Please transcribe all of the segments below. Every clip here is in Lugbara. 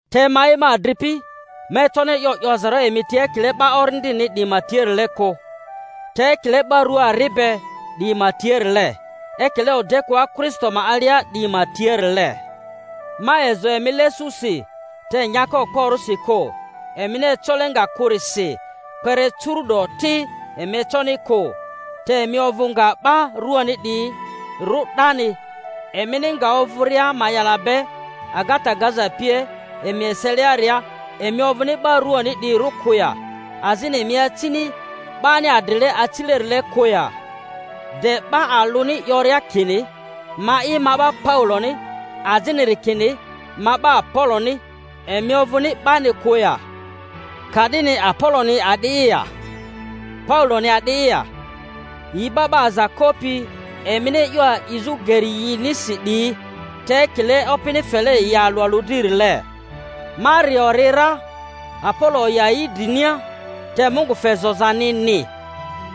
Te ma'i, ma adripi, ma econi e'yo 'yozarᴜ emi tia ekile 'ba orindini 'diyi ma tiarile kᴜ, te ekile 'ba rᴜa ari be 'diyi ma tiarile, ekile odekᴜa Kristo ma alia 'diyi ma tiarile. Ma ezo emi lesusi, te nyaka okporᴜsi kᴜ, emini ecole nga kᴜrisi; kpere curu’do ti emi econi kᴜ, te emi ovᴜ nga 'ba ruani 'diyirᴜ 'dani. Emini nga ovᴜria ma'yala be agata gaza pie emi eseliaria, emi ovᴜni 'ba ruani 'diyirᴜ kᴜ ya, azini emi acini 'bani adrile acilerile kᴜ ya? De 'ba alᴜni 'yoria kini, Ma'i ma 'ba Pauloni, aziniri kini, Ma 'ba Apoloni, emi ovᴜni 'bani kᴜ ya? Ka'dini Apoloni a'di'i ya? Pauloni a'di'i ya? Yi 'ba 'ba aza kopi emini e'yo a'izᴜ geri yinisi 'diyi, te ekile Opini fele yi alᴜ alᴜ dririle. Ma ri ori ra, Apolo oya yi drinia, te Mungu fe zozanini.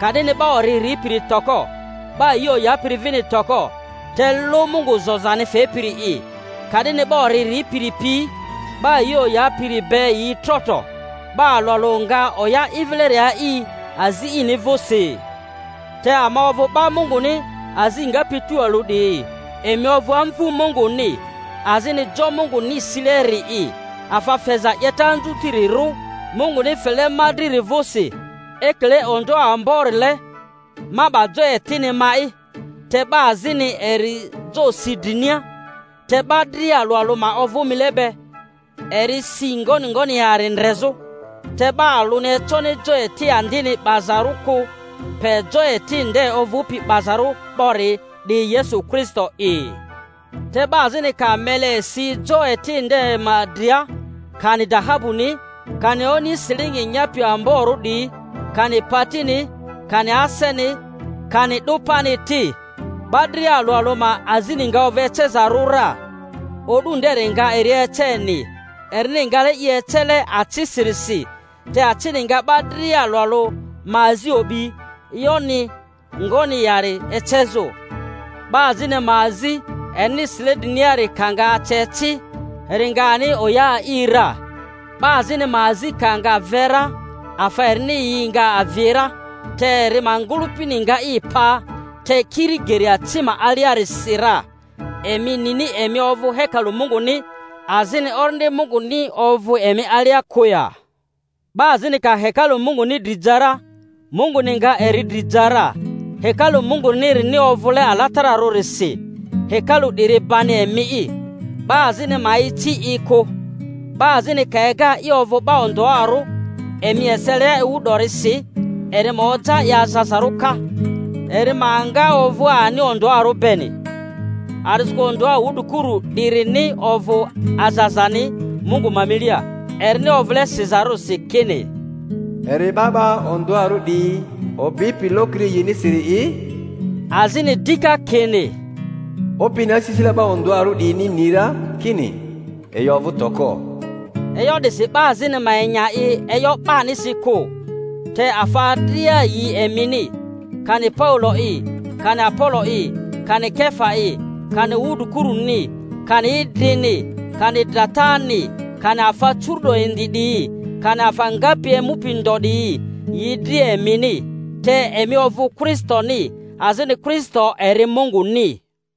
Ka'dini 'ba ori ripiri toko, 'ba yi oyapiri vini toko, te lᴜ Mungu zozani fepiri'i. Ka'dini 'ba ori ripiri pi 'ba yi oyapiri be yi tro tro, 'ba alᴜ alᴜ nga oya i vileri a'i azi ini vᴜsi. Te ama ovᴜ 'ba Munguni azi ngapi tualᴜ 'diyi; emi ovᴜ amvu Munguni, azini jo Munguni sileri'i. Afa feza 'yeta anzutirirᴜ Munguni fele ma driri vᴜsi, ekile ondᴜoᴜ amborile ma 'ba jo etini ma'i, te 'ba azini eri jo si drinia. Te 'ba dria alᴜ alᴜ ma ovᴜ mile be, eri si ngoni ngoni yari ndrezᴜ. Te 'ba alᴜni econi jo eti andini 'bazarᴜ kᴜ, pe jo eti nde ovᴜpi 'bazarᴜ 'bori, 'di Yesu Kristo'i. Te 'ba azini ka mele si jo eti nde ma dria, kani dahabuni, kani oni silingi nyapi amborᴜ 'diyi, kani patini, kani aseni, kani 'dᴜ pani ti— 'ba dria alᴜ alᴜ ma azini nga ovᴜ ecezarᴜ ra; O'du nderi nga eri eceni, erini ngale i ecele acisirisi; te acini nga 'ba dria alᴜ alᴜ ma azi o'bi, e'yo-ni ngoni yari ecezᴜ. 'Ba azini ma azi, erini sile driniari ka nga ace ci, eri nga ani oya a'i ra. 'Ba azini ma azi ka nga ve ra, afa erini yi nga avi ra, te eri ma ngᴜlᴜpini nga i pa, te kiri geri aci ma aliarisi ra. Emi nini emi ovᴜ hekalu Munguni, azini Orindi Munguni ovᴜ emi alia kᴜ ya? 'Ba azini ka hekalu Munguni dri ja ra, Munguni nga eri dri ja ra; hekalu Mungunirini ovᴜle alatararᴜrisi, hekalu 'diri bani emi'i. 'Ba azini ma ici i kᴜ. 'Ba azini ka ega i ovᴜ 'ba ondᴜarᴜ emi eselia ewu 'dorisi, eri ma oja i azazarᴜ ka, eri ma nga ovᴜ ani ondᴜarᴜ beni. A'disikᴜ ondᴜa wudrikuru 'dirini ovᴜ azazani Mungu ma milia. Erini ovᴜle sizarᴜrisi kini, Eri 'ba 'ba ondᴜarᴜ 'diyi obipi lokiri yinisiri'i, azini dika kini, Opini asisile 'ba ondᴜarᴜ 'diyini ni ra kini yi ovᴜ toko. E'yo 'disi 'ba azini ma enya i e'yo 'banisi kᴜ. Te afa dria yi emini, kani Paulo'i, kani Apolo'i, kani Kefa'i, kani wudrikuruni, kani idrini, kani dratani, kani afa curu'do indi 'diyi, kani afa ngapi emupi ndo 'diyi, yi dria emini; te emi ovᴜ Kristoni; azini Kristo eri Munguni.